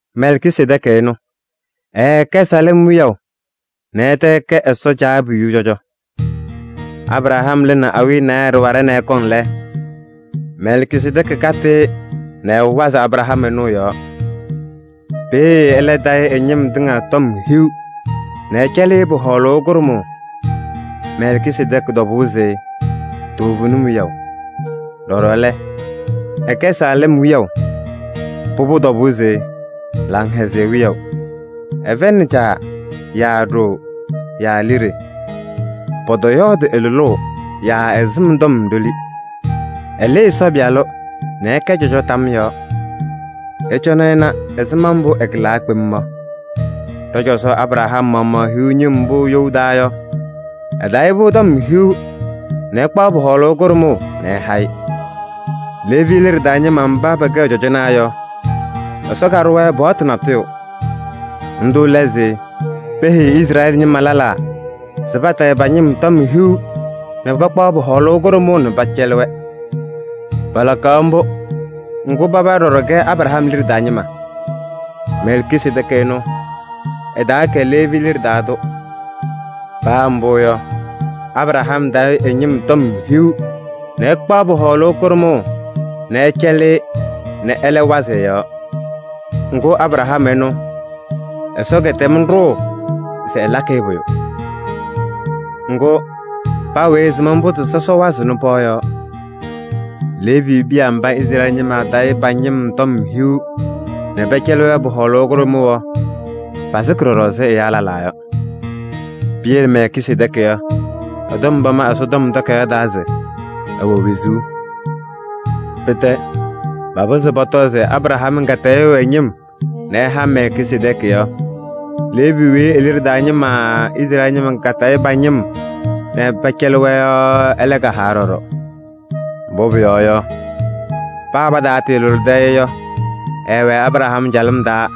Mɛlkisedɛɛkɩ ɛnʋ, ɛɛkɛ Saalɛm wiyaʋ nɛ ɛtɛ ɛkɛ Ɛsɔ Caabiyuu cɔjɔ. Abraham lɩnɩ awiya naayɛ ɖɩwaɖɛ nɛ ɛkɔŋ lɛ, Mɛlkisedɛɛkɩ katɩ-ɩ nɛ ɛwazɩ Abraham ɛnʋ ɛ-yɔɔ. Peeye ɛlɛ tayɩ ɛ-ñɩm tɩŋa tɔm hiu nɛ ɛcɛlɩ-ɩ pʋ-hɔɔlʋʋ kʋɖʋmʋʋ. Mɛlkisedɛɛkɩ tɔbʋʋ se: “Toovenim wiyaʋ.” Ɖɔɖɔ lɛ, ɛkɛ Saalɛm wiyaʋ. Pʋbʋ tɔbʋʋ se: “Laŋhɛzɩyɛ wiyaʋ.” Ɛfɛyɩnɩ caa yaa ɖoo yaa liɖe. Pɔtɔyɔɔdɩ ɛ-lʋlʋʋ yaa ɛ-sɩm tɔm ɖoli. Ɛnɩɣzɩnɩ Ɛsɔ Pɩyalʋ nɛ ɛkɛ cɔjɔ tam yɔɔ. Ɩcɔnɩ ɩna ɛzɩma mbʋ ɛkɩlaa kpem yɔ! Ɖɔ-cɔzɔ Abraham maɣmaɣ hiɣ ñɩm mbʋ you taa yɔ, ɛtayɩ-pʋ tɔm hiu nɛ ɛkpaɣ pʋ-hɔɔlʋʋ kʋɖʋmʋʋ nɛ ɛha-ɩ. Leevi liɖe taa ñɩma mba pɛkɛɣ cɔjɔnaa yɔ, Ɛsɔ kaɖʋ-wɛ paɣtʋ natʋyʋ. Ndʋ lɛ se pɔpɔzɩ Izrɛɛlɩ ñɩma lɛlaa se patayɩ pa-ñɩm tɔm hiu nɛ pakpaɣ pʋ-hɔɔlʋʋ kʋɖʋmʋʋ nɛ pɛcɛlɩ-wɛ. Palakaɣ mbʋ, ŋgʋ paba ɖɔɖɔ kɛ Abraham liɖe taa ñɩma. Mɛlkisedɛɛkɩ ɛnʋ, ɛtaakɛ Leevi liɖe taa tʋ. Paa mbʋ yɔ, Abraham tayɩ ɛ-ñɩm tɔm hiu nɛ ɛkpaɣ pʋ-hɔɔlʋʋ kʋɖʋmʋʋ nɛ ɛcɛlɩ-ɩ nɛ ɛlɛ wazɩ ɛ-yɔɔ. Ŋgʋ Abraham ɛnʋ, Ɛsɔ kɛtɛm ɖʋʋ se ɛlakɩ-ɩ pʋyʋ. Ŋgʋ, paa weyi ɛsɩm mbʋ se sɔsɔ wazɩɣnɩ pɩɣa yɔɔ. Leevi piya mba Izrɛɛlɩ ñɩma tayɩɣ pa-ñɩm tɔm hiu nɛ pɛcɛlɩɣ-wɛ pʋ-hɔɔlʋʋ kʋɖʋmʋʋ yɔ, pasɩkɩ ɖɔɖɔ ɛzɩ ɛyaa lɛlaa yɔ. Piyele Mɛlkisedɛɛkɩ yɔ, ɛ-tɔm pama Ɛsɔtɔm Takayaɣ taa se ɛwɛ wezuu. Pɩtɛ, papɩzɩɣ pɔtɔ se Abraham katayʋʋ ɛ-ñɩm nɛ ɛha Mɛlkisedɛɛkɩ yɔ, Leevi weyi e-liɖe taa ñɩma Izrɛɛlɩ ñɩma tayɩɣ pa-ñɩm nɛ pɛcɛlɩɣ-wɛ yɔ, ɛlɛ kahawa ɖɔɖɔ. Mbʋ pʋyɔɔ yɔ, paa pataalʋlɩdɩ-ɩ yɔ, ɛɛwɛ Abraham calɩm taa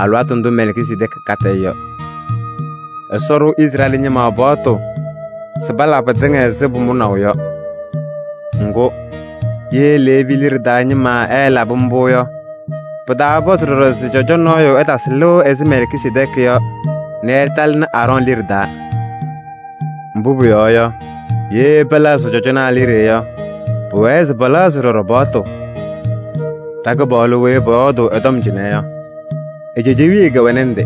alɩwaatʋ ndʋ Mɛlkisedɛɛkɩ katɩ-ɩ yɔ. Ɛsɔ ɖʋ Izrɛɛlɩ ñɩma paɣtʋ se pala pɩtɩŋa ɛzɩ pʋmʋnaʋ yɔ. Ŋgʋ, ye Leevi liɖe taa ñɩma ɛɛlabɩ mbʋ yɔ, pɩtaapɔzɩ ɖɔɖɔ se cɔjɔ nɔɔyʋ ɛtasɩ lɩʋ ɛzɩ Mɛlkisedɛɛkɩ yɔ nɛ ɛtalɩnɩ Aarɔɔnɩ liɖe taa. Mbʋ pʋyɔɔ yɔ, ye pɛlɛɣzɩ cɔjɔnaa liɖe yɔ, pʋwɛɛ se pɛlɛɣzɩ ɖɔɖɔ paɣtʋ. Ɖa-Kɩpaɣlʋ weyi pɔyɔɔdʋʋ ɛ-tɔm cɩnɛ yɔ, e-cejewiye kɛwɛnɩ ndɩ.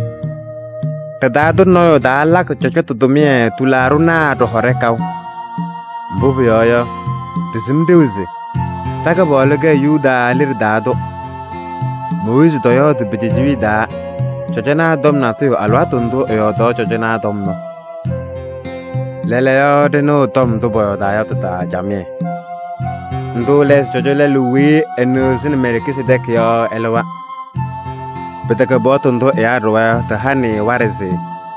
Ɖɩ-taa tʋ nɔɔyʋ taalakɩ cɔjɔtʋ tʋmɩyɛ tɩlaaɖɩnaa ɖɩhɔɖɛ kaʋ. Mbʋ pʋyɔɔ yɔ, ɖɩsɩm ɖeu se ɖa-Kɩpaɣlʋ kɛ Yuda liɖe taa tʋ. Mooyiizi tɔyɔɔdɩ pe-cejewiye taa cɔjɔnaa tɔm natʋyʋ alɩwaatʋ ndʋ ɛyɔɔdaɣ cɔjɔnaa tɔm yɔ. Lɛɛlɛɛyɔ ɖɩnɩɣ tɔm ndʋ pɔyɔɔdaa yɔ tɩ-taa camɩyɛ: ndʋ lɛ se cɔjɔ lɛlʋ weyi ɛnɩɣzɩnɩ Mɛlkisedɛɛkɩ yɔ, ɛlɩwa. Pɩtɛkɛ paɣtʋ ndʋ ɛyaa ɖʋwa yɔ tɩhanɩ-ɩ waɖɛ se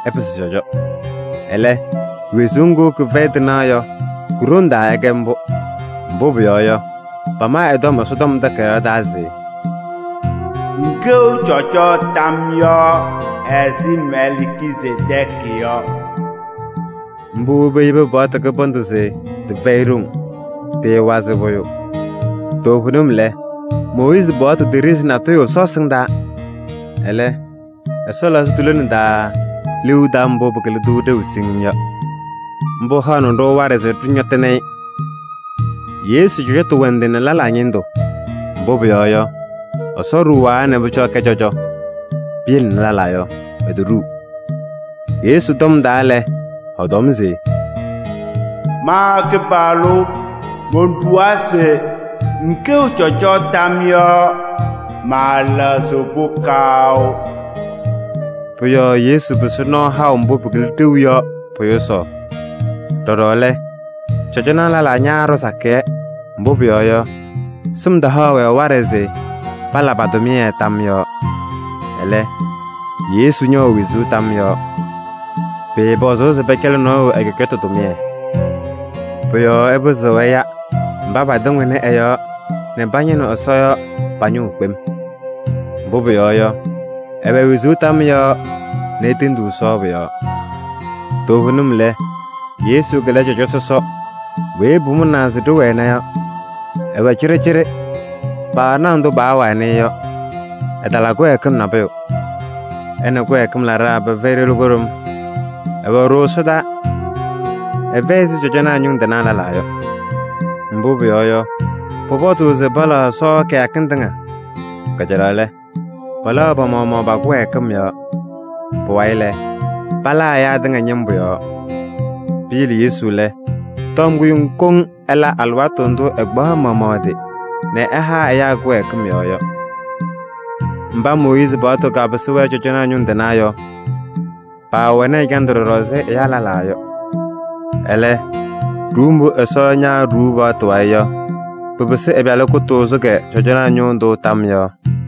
ɛpɩsɩ cɔjɔ. Ɛlɛ, wezuu ŋgʋ kɩfɛyɩ tɩnaɣ yɔ, ku-ɖoŋ taa ɛkɛ mbʋ. Mbʋ pʋyɔɔ yɔ, pama ɛ-tɔm Ɛsɔtɔm Takayaɣ taa se: “Ŋkɛɣ cɔjɔ tam yɔɔ ɛzɩ Mɛlkisedɛɛkɩ yɔ.” Mbʋ peyebi paɣtʋ kɩbɩndʋ se tɩfɛyɩ ɖoŋ, tɩɩwazɩɣ pʋyʋ. Toovenim lɛ, Mooyiizi paɣtʋ teɖezi nabʋyʋ Ɛsɔ ɛsɩndaa. Ɛlɛ, Ɛsɔ lɛɣzɩ tu-lone taa liu taʋ mbʋ pɩkɩlɩ-tʋ ɖeu siŋŋ yɔ. Mbʋ haɣnɩ-ɖʋ waɖɛ se ɖɩñɔtɩnɩ-ɩ. Yesu cɔjɔtʋ wɛ ndɩ nɛ lɛlaa ñɩndʋ. Mbʋ pʋyɔɔ yɔ, Ɛsɔ ɖuwaa nɛ pʋcɔ ɛkɛ cɔjɔ. Piyele lɛlaa yɔ, etoɖuu. Yesu tɔm taa lɛ, ɛɛtɔm se: “Ma Kɩpaɣlʋ monɖuwaa se: ‘ŋkɛɣ cɔjɔ tam yɔɔ.’ Maalɛɣzɩɣ-pʋ kaʋ.” Pʋ-yɔɔ Yesu pɩsɩ nɔɔ haʋ mbʋ pɩkɩlɩ ɖeu yɔ pʋ-yʋsaɣ. Ɖɔɖɔ lɛ, cɔjɔnaa lɛlaa ñaaɖɔ sakɩyɛ, mbʋ pʋyɔɔ yɔ, sɩm tahaɣ-wɛ waɖɛ se pala pa-tʋmɩyɛ tam yɔɔ. Ɛlɛ, Yesu ñɛwɛ wezuu tam yɔɔ. Pɩɩpɔzʋʋ se pɛcɛlɩ nɔɔyʋ ɛ-cɔjɔtʋ tʋmɩyɛ. Pʋ-yɔɔ ɛpɩzɩɣ ɛya mba patɩŋɩɣnɩ ɛ-yɔɔ nɛ pañɩnɩɣ Ɛsɔ yɔ pa-ñʋʋ kpem. Mbʋ pʋyɔɔ yɔ, ɛwɛ wezuu tam yɔɔ nɛ etendiɣ Ɛsɔ pɔ-yɔɔ. Toovenim lɛ, Yesu lɛ cɔjɔ sɔsɔ weyi pʋmʋnaa se ɖɩwɛna yɔ: ɛwɛ cɩɖɩcɩɖɩ, paanaɣ ndʋ paawanɩ-ɩ yɔ, ɛtala kɩwɛɛkɩm nabʋyʋ. Ɛ nɛ kɩwɛɛkɩm laɖaa pɛfɛyɩ ɖoli kʋɖʋm, ɛwɛ ɖooo ɛsɔdaa. Ɛfɛyɩ ɛzɩ cɔjɔnaa ñʋŋ tɩnaa lɛlaa yɔ. Mbʋ pʋyɔɔ yɔ, pʋpɔzʋʋ se palaɣ Ɛsɔ kɩyakɩŋ tɩŋa. Kajalaɣ lɛ, palaɣ pa-maɣmaɣ pa-kɩwɛɛkɩm yɔɔ. Pʋwayɩ lɛ, palaa ɛyaa tɩŋa ñɩmbʋ yɔɔ. Piyele Yesu lɛ, tɔm kʋɖʋm koŋ ɛla alɩwaatʋ ndʋ ɛkpaɣ ɛ-maɣmaɣ ɛ-tɩ nɛ ɛha ɛyaa kɩwɛɛkɩm yɔɔ yɔ. Mba Mooyiizi paɣtʋ kapɩsɩ-wɛ cɔjɔnaa ñʋŋ tɩnaa yɔ, paawɛnɩ ɛjandʋ ɖɔɖɔ ɛzɩ ɛyaa lɛlaa yɔ. Ɛlɛ, ɖuuu mbʋ Ɛsɔ ñaaɖuu paɣtʋ wayɩ yɔ, pɩpɩsɩ ɛ-Pɩyalʋ kʋtʋʋzʋ cɔjɔnaa ñʋʋ tʋ tam yɔɔ.